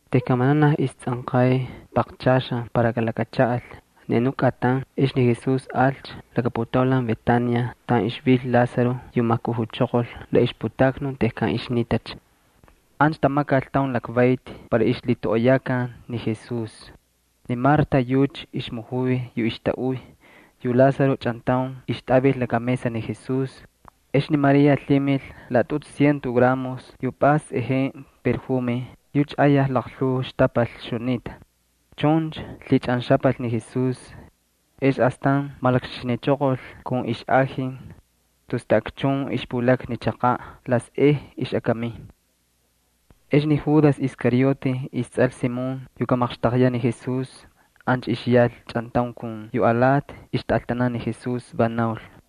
Tejkan vananaj istsꞌanqay paqchaxan para kalakachaꞌal ni xakꞌatan Paxku, ex ni Jesús alcha laka putaulan Betania, taꞌan ixvil ni Lázaro yu majkujuchoqol la ixputaknun tejkan ixnitacha. Ancha tamakal taun lakvayti para ixlhitoꞌoyakan ni Jesús. Ni Marta yucha ixmujuy yu ixtaꞌuy. Yu Lázaro chꞌantaun ixtꞌavil laka mesa ni Jesús. Ex ni María lhimil laꞌatꞌutu ciento gramos yu pꞌays sꞌejenꞌe yu ayaj laqlhuu xtapal ixjunita. Chuncha lhichꞌanxapal ni Jesús. Ex astan malakxixinichoqol kun ixꞌaji. Tus taꞌakchun ixpulakna ni chaqaꞌ la sꞌej ixꞌakamin. Ex ni Judas Iscariote, istsꞌal Simón yu kamaqxtaqyaꞌ ni Jesús, ancha ixyal chꞌantaun kun yu alati ixtꞌaltanan ni Jesús, va naul: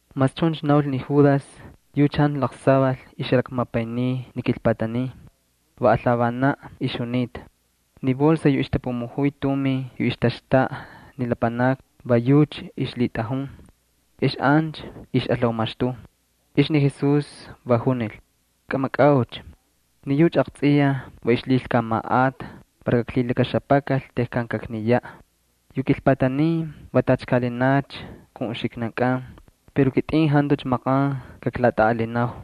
Mas chuncha naul ni Judas yucha jantu laqsaval ixjalakmapayniy ni kilpatanin, va alhavanaꞌ ixjunita. Ni bolsa yu ixtapumujuy tumin yu ixtaxtaꞌa ni lapanakni, va yucha ixlhitꞌajun ex ancha ixꞌalhaumaxtuy. Ex ni Jesús va junil: —Kꞌamakꞌaucha. Ni yucha aqtsꞌiyaj va ixlhilkamaꞌata para kaklhilakaxapakal tejkan kakniyaꞌ. Yu kilpatanin va tacha kaꞌalinacha kun uxiknankꞌan, pero yu kitꞌin jantucha maqan kaklatꞌaꞌalinau.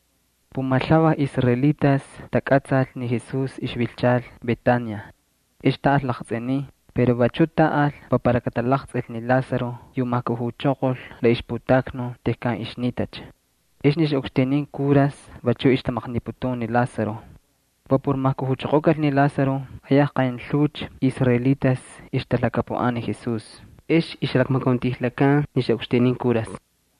Pumalhuvaj israelitas takꞌatsal ni Jesús ixvilchal Betania. Ex taꞌal laqtsꞌinin pero vachu taꞌal va para katalaqtsꞌil ni Lázaro yu majkujuchoqol la ixputaknun tejkan ixnitacha. Ex ni xaꞌukxtinin kuras vachu ixtamaqniputun ni Lázaro. Va por majkujuchoqokal ni Lázaro ayaj qaynlhuucha israelitas ixtalhakapuꞌan ni Jesús, ixtatꞌajun tamakauntꞌaꞌanan ni xaꞌukxtinin kuras.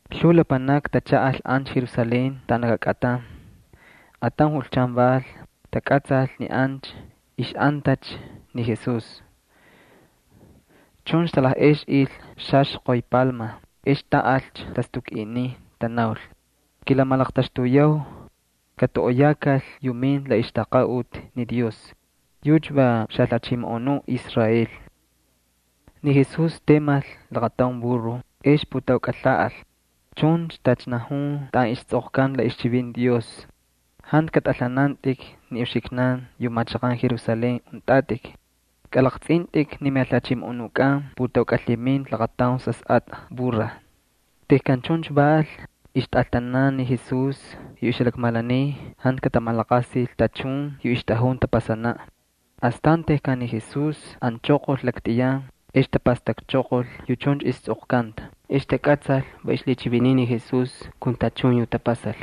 Lhuu lapanakni tachaꞌal ancha Jerusalén taꞌan laka kꞌatan Paxku. Ataun julchan val, takꞌatsal ni ancha ixꞌantacha ni Jesús. Chuncha talajꞌexꞌil xaxqoy chꞌapꞌa ex taꞌalcha tastukꞌinin, tanaul: —¡Kilamalaqtaxtuyau! ¡Katoꞌoyakal yu minta la ixtaqaꞌuti ni Dios! ¡Yucha va xaJalhachimoꞌonuꞌ Israel! Ni Jesús temal laqataun burro ex putaukꞌalhaꞌal, chuncha tacha najun taꞌan istsꞌoqkanta la ixchivinti Dios: Jantu katꞌalhanantꞌik ni uxiknan yu machaqan Jerusalén untꞌatꞌik. Kꞌalaqtsꞌintꞌik ni miJalhachimoꞌonukꞌan, putaukꞌalhiminta laqataun sasꞌatꞌa burra. Tejkan chuncha val, ixtꞌaltanan ni Jesús yu ixjalakmalaniy jantu katamalaqasil tachun yu ixtꞌajun tapasanaꞌ. Astan tejkan ni Jesús anchoqol laktꞌiyan ex tapastakchoqol yu chuncha istsꞌoqkanta. Ex takꞌatsal va ixlhichiviniy ni Jesús kun tachun yu tapasal.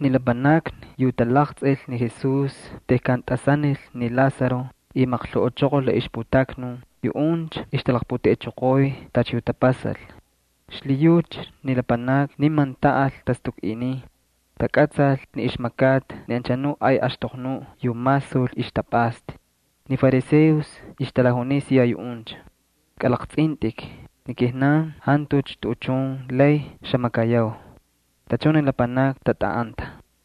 Ni lapanakni yu talaqtsꞌil ni Jesús tejkan tꞌasanil ni Lázaro y majkujuchoqol la ixputaknun, yuꞌuncha ixtalaqputeꞌechoqoy tacha yu tapasal. Xlhiyucha ni lapanakni niman taꞌal tastukꞌinin. Takꞌatsal ni ixmakata ni anchanuꞌ ay axtoqnuꞌ yu masul ixtapꞌasta. Ni fariseos ixtalajuniy siya yuꞌuncha: —Kꞌalaqtsꞌintꞌik, ni kijnan jantucha tuꞌuchun lay xamakayau. Tachun ni lapanakni tatꞌaꞌanta.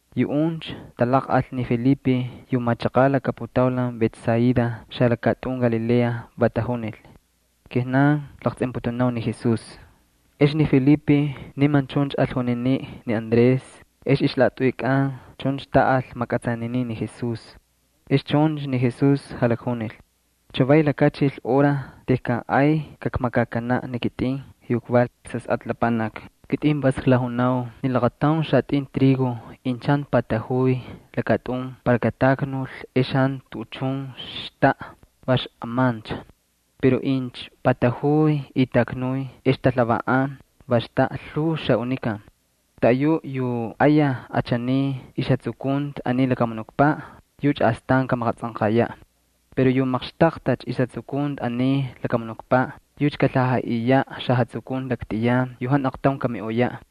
Yuꞌuncha talaqꞌal ni Felipe yu machaqaꞌ laka putaulan Betsaida xalakatꞌun Galilea, va tajunil: —Kijnan klaqtsꞌinputunau ni Jesús. Ex ni Felipe niman chuncha al juniniꞌ ni Andrés, ex ixlaꞌatꞌuykꞌan chuncha taꞌal makꞌatsaninin ni Jesús. Ex chuncha ni Jesús jalakjunil: —Chavay lakachilcha hora tejkan ay kakmakakanaꞌ ni kitꞌin yu kval Sasꞌatꞌa Lapanaki. Kitꞌin vas klajunau ni laqataun xatꞌin trigo incha jantu patajuy lakatꞌun para kataknul ex jantu tuꞌuchun xtaꞌa, va xꞌamancha. Pero incha patajuy y taknuy ex talhavaꞌan, va xtaꞌa lhuu xaꞌunikan. Taꞌayuꞌ yu ayaj achaniy ixjatsukunti aniy lakamunukpaꞌ, yucha astan kamaqatsꞌanqayaꞌ. Pero yu maqxtaqtacha ixjatsukunti aniy lakamunukpaꞌ yucha kalhajaꞌiyaꞌ xajatsukunti laktꞌiyan yu jantu aqtaun kamiꞌoyaꞌ.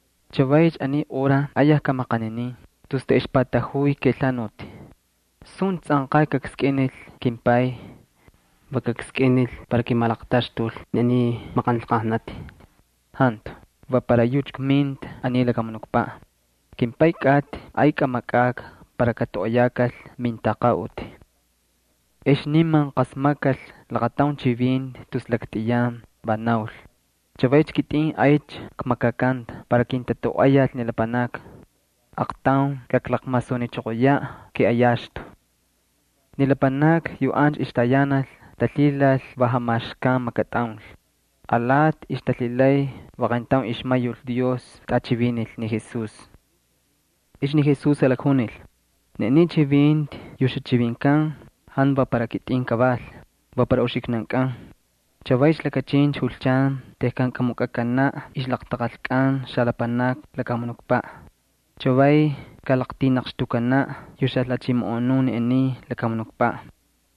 —Chavaycha aniy hora ayaj kmaqaninin, tus taꞌexpatajuy kelhanuti. ¿Suncha tsꞌanqay kakskꞌinil kimPay? ¿Va kakskꞌinil para kimalaqtaxtul ni aniy maqanlqajnati? Jantu, va para yucha kminta ni aniy lakamunukpaꞌ. KimPay kꞌatꞌi, ay kꞌamakꞌakꞌa para katoꞌoyakal mintaqaꞌuti. Ex niman qasmakkal laqataun chivinti tus laktꞌiyan, va naul: —Chavaycha kitꞌin aycha kmakakanta para kintatoꞌoyal ni lapanakni. Aaqtaun kaklakmasunichoqoyaꞌ kiꞌayaxtu. Ni lapanakni yu ancha ixtayanal talhilal va jamaxkan makatꞌaul. Alati ixtalhilay va qayntaun ixmayul Dios tꞌachivinil ni Jesús. Ex ni Jesús jalakjunil: —Ni aniy chivinti yu xachivinkan jantu va para kitꞌin kaval, va para uxiknankꞌan. Chavaycha lakachincha julchan tejkan kamukꞌakanaꞌ ixlaqtaqalkꞌan xalapanakni lakamunukpaꞌ. Chavay kalaqtinaqxtukanacha yu xajalhachimoꞌonuꞌ ni aniy lakamunukpaꞌ.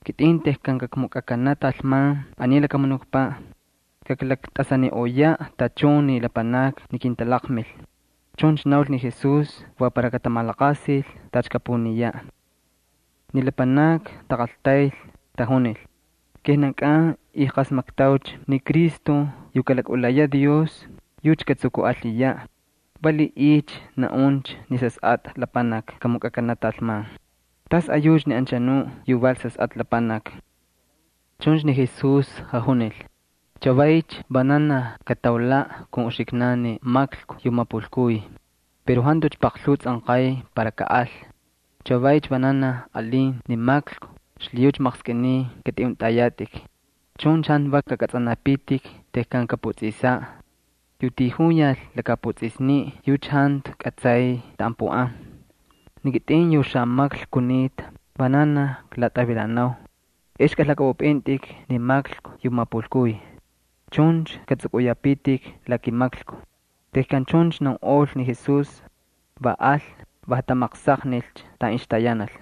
Kitꞌin tejkan kakmukꞌakanaꞌ talman aniy lakamunukpaꞌ, kaklaktꞌasaniꞌoyacha tachun ni lapanakni ni kintalaqmil. Chuncha naul ni Jesús para katamalaqasil tacha kapuniyaꞌ. Ni lapanakni taqaltayl, tajunil: —Kijnankꞌan ijqasmatꞌaucha ni Cristo yu kalakꞌulayaꞌ Dios, yucha katsukuꞌalhiyaꞌ. ¿Valiꞌiycha naꞌuncha ni Sasꞌatꞌa Lapanaki kamukꞌakanaꞌ talman? ¿Tasꞌayucha ni anchanuꞌ yu val Sasꞌatꞌa Lapanaki? Chuncha ni Jesús jajunil: —Chavaycha vananaj kataulaꞌ kun uxiknan ni maklku yu mapulkuy. Pero jantucha paqlhuu tsꞌanqay para kaꞌal. Chavaycha vananaj alin ni maklku xlhiyucha maqskꞌiniy katꞌiꞌuntꞌayatꞌik. Chuncha jantu vak kakꞌatsꞌanapitik tejkan kaputsꞌisaꞌ. Yu tijuyal lakaputsꞌisni yucha jantu kꞌatsay taꞌan puꞌan. Ni kitꞌin yu xamaklku kunita, vananaj klatꞌavilanau. Ex kꞌalhakꞌapꞌupꞌintꞌik ni maklku yu mapulkuy. Chuncha kꞌatsꞌukꞌuyapitik la kimaklku. Tejkan chuncha naunꞌol ni Jesús, va al, va jatamaqsaqnilcha taꞌan ixtayanal.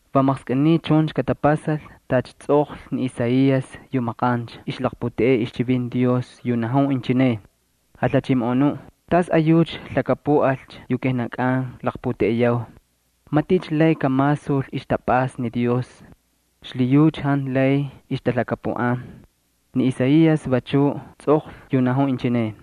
Va maqskꞌiniy chuncha katapasal tacha tsꞌoqlhi ni Isaías yu maqancha ixlaqputeꞌey ixchivinti Dios, yu najun inchineꞌ: Jalhachimoꞌonuꞌ, ¿tasꞌayucha lhakapuꞌalcha yu kijnankꞌan klaqputeꞌeyau? ¿Maticha lay kalaqtsꞌil ixtapꞌasta ni Dios? Xlhiyucha jantu lay ixtalhakapuꞌan. Ni Isaías vachu tsꞌoqlhi yu najun inchineꞌ: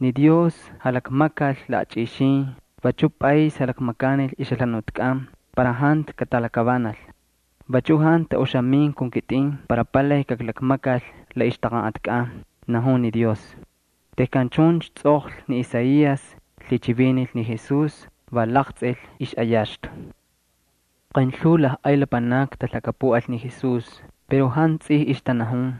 Ni Dios jalakmakal laꞌachꞌixin, vachuꞌ pꞌays jalakmakanil ixjalhanutkꞌan para jantu katalakavanal y jantu katamalaqasil la ixjalhanutkꞌan. Vachu jantu taꞌuxamin kun kitꞌin para palay kaklakmakal la ixtaqanꞌatkꞌan. Tejkan chuncha tsꞌoqlhi ni Isaías lhichivinil ni Jesús, va laqtsꞌil ixꞌayaxtu. Qaynlhuu lajꞌay lapanakni talhakapuꞌal ni Jesús, pero jantu tsij ixtanajun.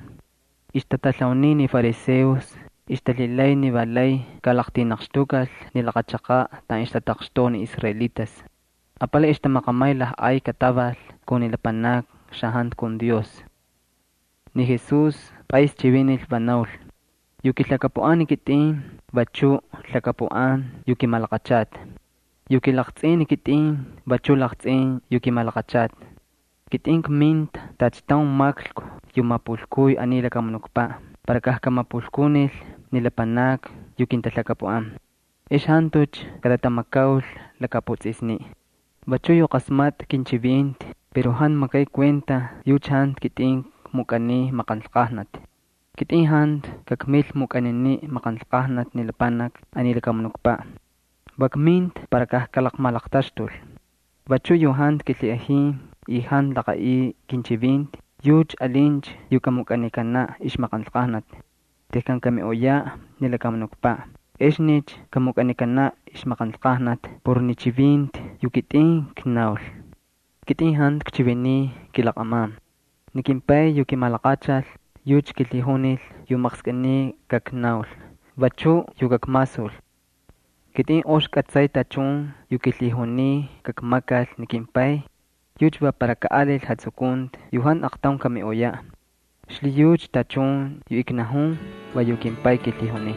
Ixtatalhauniy ni fariseos, ixtalhilay ni va lay kalaqtinaqxtukal ni laqa chaqaꞌ taꞌan ixtataqxtoꞌa ni israelitas. Apalay ixtamaqamay lajꞌay kataval kun ni lapanakni xajantu kun Dios. Ni Jesús pꞌays chivinil, va naul: —Yu kilhakapuꞌan ni kitꞌin vachu lhakapuꞌan yu kimalaqachata. Yu kilaqtsꞌin ni kitꞌin vachuꞌ laqtsꞌin yu kimalaqachata. Kitꞌin kminta tacha taun maklku yu mapulkuy aniy lakamunukpaꞌ para kajkamapulkunil ni lapanakni yu kintalhakapuꞌan. Ex jantucha katatamakaul lakaputsꞌisni. Vachu yu qasmatꞌa kinchivinti pero jantu makay kuenta, yucha jantu kitꞌin kmukꞌaniy maqanlqajnati. Kitꞌin jantu kakmil mukꞌaniniꞌ maqanlqajnati ni lapanakni aniy lakamunukpaꞌ. Va kminta para kajkalaqmalaqtaxtul. Vachu yu jantu kilhiꞌajin y jantu laqaꞌiy kinchivinti yucha alincha yu kamukꞌaniyaꞌ ixmaqanlqajnati. Tejkan kamiꞌoyaꞌ ni lakamunukpaꞌ exnicha kamukꞌanikanaꞌ maqanlqajnati por ni chivinti yu kitꞌin knaul. Kitꞌin jantu kchiviniy kilaqꞌaman, ni kimPay yu kimalaqachal yucha kilhijunil yu maqskꞌiniy kaknaul, vachuꞌ yu kakmasul. Kitꞌin ox kꞌatsay tachun yu kilhijuniy kakmakal ni kimPay, yucha va para kaꞌalil jatsukunti yu jantu aqtaun kamiꞌoyaꞌ. Xlhiyucha tachun yu knajun va yu kimPay kilhijuniy.